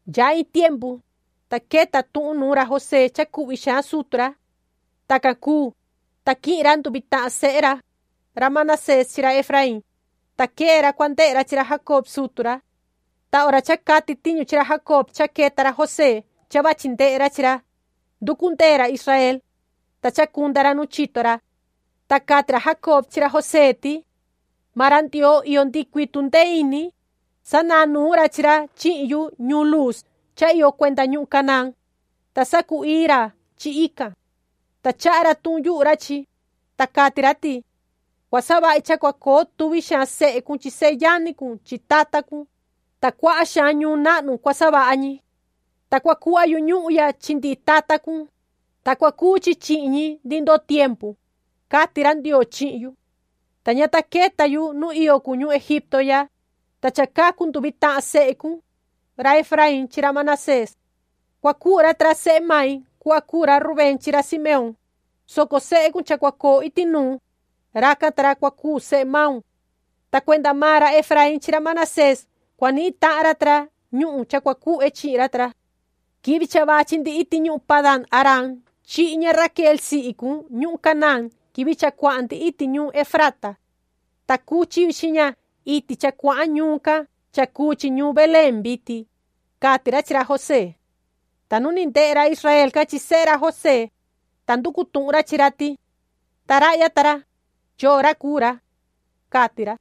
Yaha iin tiempu, ta queta tuhun nuun ra José cha cuhvi xaan sutu ra. Tacan cuu, ta quihin ra nduvi tahan sehe ra, ra Manasés chi ra Efraín, ta quee ra cua ndehe ra chi ra Jacob sutu ra. Ta hora cha cati tiñu chi ra Jacob cha queta ra José cha vachi ndehe ra chi ra, nducu ndee ra Israel, ta chacunda ra nu chito ra. Ta cati ra Jacob chi ra José ti: ―Maan ra Ndioo iyo ndihi cuii tundee ini, sanahan nuun ra chi ra chihin yu ñuun Luuz cha iyo cuenda ñuhun Canaán, ta sacu-ii ra chi ican. Ta chaha ra tuhun yuhu ra chi, ta cati ra ti: ‘Cua savahi cha cua coo tuvi xaan sehe cun chi seyani cun chi tata cun, ta cuaha xaan ñuun nahnu cua savaha ñi. Ta cua cuhva yu ñuhun ya chi ndihi tata cun, ta cua cuu chi chihin ñi ndihi ndoo tiempu’, cati ra Ndioo chihin yu. Ta ña ta queta yu nu iyo cun ñuhun Egipto ya, ta cha cacu nduvi tahan sehe cun, ra Efraín chi ra Manasés. Cua cuu ra ta ra sehe mai cuhva cuu ra Rubén chi ra Simeón, soco sehe cun cha cua coo iti nuu, racan ta ra cua cuu sehe maun. Ta cuenda maan ra Efraín chi ra Manasés cua nihin tahan ra ta ra ñuhun cha cua cuhve chi ra ta ra. Quivi cha vachi ndi iti ñuhun Padan-aram chihi ña Raquel sihi cun ñuhun Canaán quivi cha cuahan ndi iti ñuun Efrata. Ta cuchi yu chi ña iti cha cuahan ñuun can cha cuu chi ñuun Belén vitin ―cati ra chi ra José. Ta nu ni ndehe ra Israel can chi sehe ra José, ta nducu tuhun ra chi ra ti: ―¿Ta rahya ta ra, yoo ra cuu ra? ―cati ra.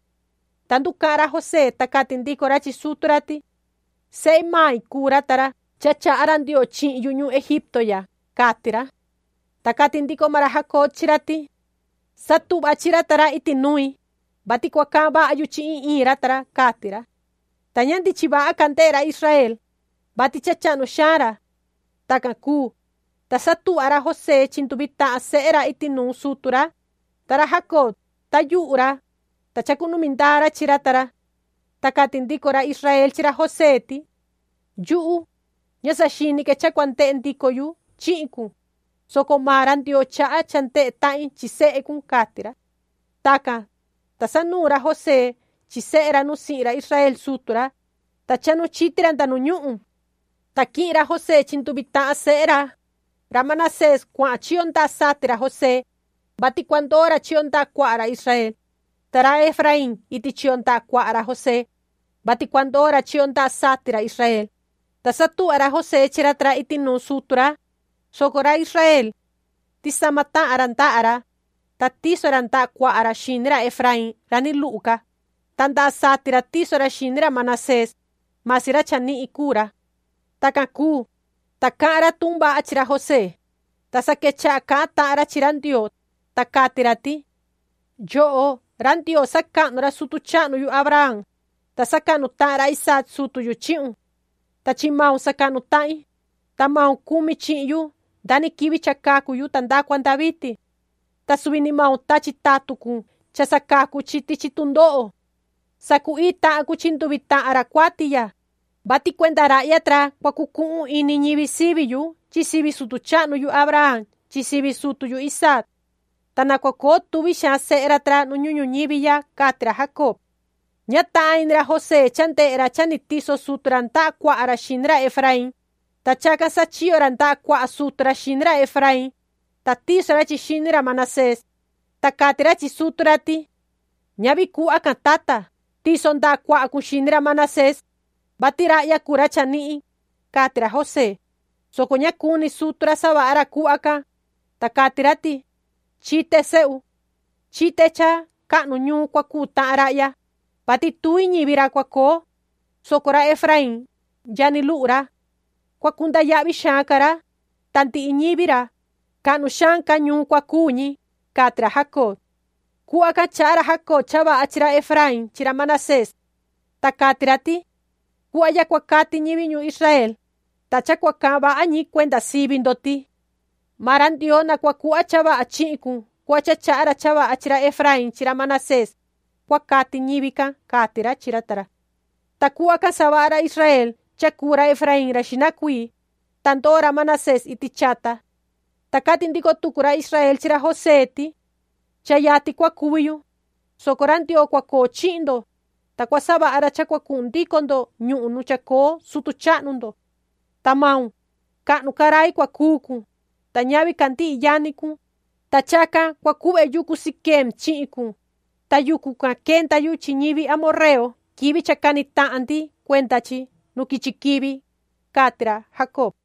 Ta nducahan ra José, ta cati ndico ra chi sutu ra ti: ―Sehe mai cuu ra ta ra cha chaha ra Ndioo chihin yu ñuhun Egipto ya ―cati ra. Ta cati ndico maan ra Jacob chi ra ti: ―Satuhva chi ra ta ra iti nui, vati cua cahan vaha yu chi iin iin ra ta ra ―cati ra. Ta ña ndichin vaha ca ndehe ra Israel, vati cha chahnu xaan ra. Tacan cuu, ta satuhva ra José chi nduvi tahan sehe ra iti nuun sutu ra, ta ra Jacob, tayuhu ra, ta chacunumi ndaa ra chi ra ta ra. Ta cati ndico ra Israel chi ra José ti: ―Yuhu, ña saxini que cha cua ndehe ndico yu chihin cun, soco maan ra Ndioo chaha cha ndehe tahin chi sehe cun ―cati ra. Tacan, ta sanuun ra José chi sehe ra nu sihin ra Israel sutu ra. Ta chahnu chiti ra nda nu ñuhun. Ta quihin ra José chi nduvi tahan sehe ra, ra Manasés cuahan chiyo ndaha sati ra José, vati cua ndoo ra chiyo ndaha cuaha ra Israel, ta ra Efraín iti chiyo ndaha cuaha ra José, vati cua ndoo ra chiyo ndaha sati ra Israel, ta satuhva ra José chi ra ta ra iti nuun sutu ra, soco ra Israel, tisama tahan ra ndaha ra, ta tiso ra ndaha cuaha ra xini ra Efraín ra ni luhu ca, ta ndaha sati ra tiso ra xini ra Manasés, masi ra cha nihin cuu ra. Tacan cuu, ta cahan ra tuhun vaha ra chi ra José, ta sa quechaha cahan tahan ra chi ra Ndioo, ta cati ra ti: “Yoho ra Ndioo, sacahnu ra sutu chahnu yu Abraham, ta sacahnu tahan ra Isaac sutu yu chihun. Ta chi maun sacahnu tahin, ta maun cumi chihin yu nda ni quivi cha cacu yu ta nda cua nda vitin. Ta suvi ni maun tachi tatun cun cha sacacu chi tichi tundoho. Sacu-ii tahan cun chi nduvi tahan ra cuati ya, vati cuenda rahya ta ra cua cucuhun ini ñivi sivi yu chi sivi sutu chahnu yu Abraham chi sivi sutu yu Isaac. ¡Ta na cua coo tuvi xaan sehe ra ta ra nu ñuhun ñuñivi ya!”, cati ra Jacob. Ña tahan ini ra José cha ndehe ra cha tiso sutu ra ndaha cuaha ra xini ra Efraín, ta chacan sachiyo ra ndaha cuaha sutu ra xini ra Efraín, ta tiso ra chi xini ra Manasés, ta cati ra chi sutu ra ti: ―¡Ñavi cuhva can, tata! ¡Tiso ndaha cuaha cun xini ra Manasés, vati rahya cuu ra chanihin! ―cati ra José, soco ña cuni sutu ra savaha ra cuhva can, ta cati ra ti: ―Chite, sehu. Chite cha cahnu ñuun cua cuu tahan rahya, vati tuvi ñivi ra cua coo, soco ra Efraín, yani luhu ra. Cua cunda yahvi xaan ca ra, ta ndihi ñivi ra, cahnu xaan ca ñuun cua cuu ñi ―cati ra Jacob. Cuhva can chaha ra Jacob cha vaha chi ra Efraín chi ra Manasés. Ta cati ra ti: ―Cuhva ya cua cati ñivi ñuun Israel, ta cha cua cahan vaha ñi cuenda sivi ndo ti: ‘Maan ra Ndioo na cua cuhva cha vaha chihin cun cuhva cha chaha ra cha vaha chi ra Efraín chi ra Manasés’, cua cati ñivi can ―cati ra chi ra ta ra. Ta cuhva can savaha ra Israel cha cuu ra Efraín ra xihna cuii, ta ndoo ra Manasés iti chata. Ta cati ndico tucu ra Israel chi ra José ti: ―Cha yatin cua cuvi yu, soco ra Ndioo cua coo chihin ndo, ta cua savaha ra cha cua cuhun ndico ndo ñuhun nu chacoo sutu chahnu ndo. Ta maun, cahnu ca rai cua cuu cun, ta ñavi ca ndihi yani cun, ta chacan cua cuhve yucu Siquem chihin cun, ta yucu can quenda yu chi ñivi amorreo quivi cha cani tahan ndi cuenda chi nu quichi quivi ―cati ra Jacob.